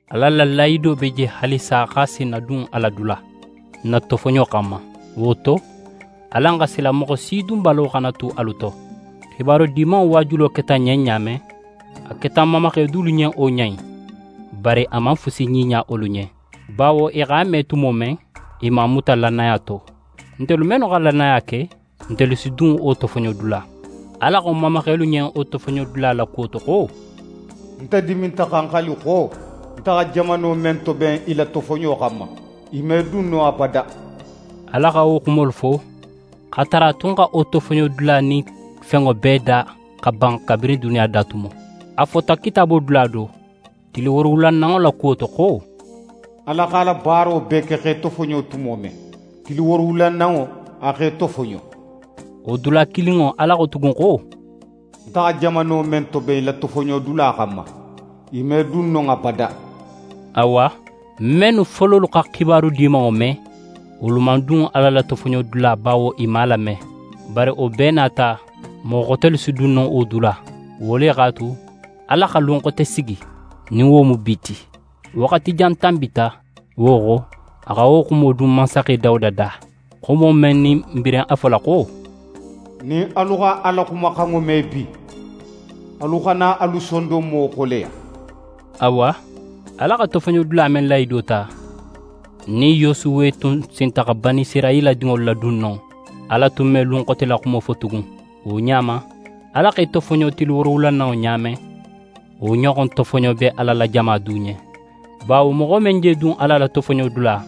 Ala la lahido be je haalisa xo a si n nadun a la dula, n na tofoɲo xanma. Wo to, alan xa sila moxo si dunbalo xana tu alu to. xibaru Dimanŋo waajulo keta n ɲen ɲa men, a keta n mamaxe dulu ɲen wo ɲa in. Bari a man fusi ɲiɲa wolu ɲen, bawo i x'a me tumo men, i man a muta lannaya to. Ntelu mennu xa lannaya ke, ntelu si dun wo tofoɲodula. Ala xo n mamaxelu ɲen wo tofoɲodula la kuwo to xo: «Nte diminta xa ń xali xo, Nte xa jamano men toben i la tofoɲo xanma, i me dun non abada.» Ala xa wo xumolu fo, x'a tara a tun xa wo tofoɲodula nin fenŋo bee da xa ban kabirin duniya da tumo. A fota Kitaabo dula do, tili woorowulananŋo la kuwo to xo: «Ala x'a la baaro bee ke x'é soto tumo men, tili woorowulananŋo a x'é tofoɲo.» Wo dula kilinŋo Ala xo tugun xo: «Nte xa jamano men toben i la tofoɲodula xanma, i me dun non abada!» Awa, mennu fololu xa Xibaru Dimanŋo me, wolu man dun Ala la tofoɲodula bawo i man a lame. Bari wo bee nin a ta, moxo xotelu si dun no wo dula. Wo le x'a tu, Ala xa lun xote sigi, nin wo mu «bi» ti. Waxati jan tanbita, wo xo, a xa wo xumo dun mansaxe Dawuda da, xumo men nin n birin a fola xo: «Nin alu xa Ala xumaxanŋo me bi, alu xana alu sondonmo xoleya.» Awa, Ala xa tofoɲodula men lahido ta, nin Yosuwe tun sinta xa Banisirayila dinŋolu ladun non, Ala tun me lun xote la xumo fo tugun. Wo ɲa ma, Ala x'é tofoɲo tili woorowulananŋo ɲa men, wo ɲoxon tofoɲo be Ala la jama du ɲen. Bawo moxo men je dun Ala la tofoɲodula,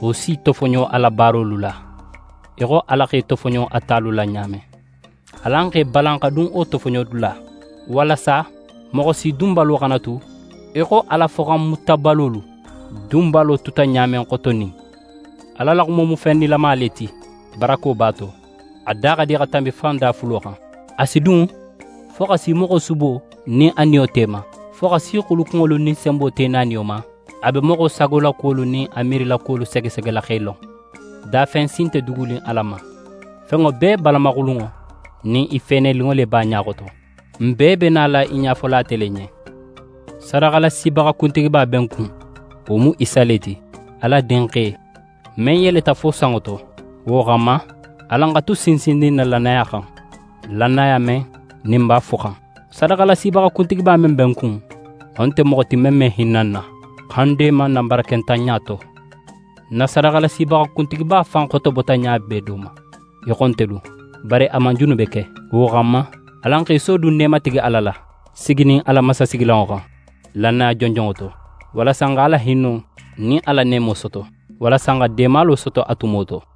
wo s'í tofoɲo a la baarolu la, í xo Ala x'é tofoɲo a talu la ɲa men. Alan x'e balan xa dun wo tofoɲodula, walasa moxo si dunbalo xana tu í xo Ala foxanmutabalolu dunbalo tuta ɲa men xotonin. Ala la xumo mu fen nilama le ti. Barako b'a to, a da xa di xa tanbi fan dafulo xan. A si dun fo xa si moxo subo nin a niyo te ma, fo xa si xulukunŋolu nin senbo te naaniyo ma. A be moxo sagolakuwolu nin a miirilakuwolu segesegela x'e lon. Dafen si nte dugunin Ala ma. Fenŋo bee balamaxulunŋo nin i feeneninŋo le be a ɲa xoto. N bee be nala i ɲafola ate le ɲen. Sadaxalasibaxa kuntigiba be n kun. Wo mu Isa le ti: Ala Dinxe, men yeleta fo sanŋo to. Wo xanma, alan xa tu sinsinnin n na lannaya xan, lannaya men, nin n b'a foxan. Sadaxalasibaxa kuntigiba men be n kun, wo nte moxo ti men me hinna n na, xa n deema n na barakentanɲa to. N na sadaxalasibaxa kuntigiba fan xotobota ɲa bee do ma í xo ntelu, bari a man junube ke. Wo xanma, alan x'e sodun neematigi Ala la, siginin a la mansasigilanŋo xan, lannaya jonjonŋo to, walasa n x'a la hinno nin a la neemo soto, walasa n xa deemalo soto a tumo to.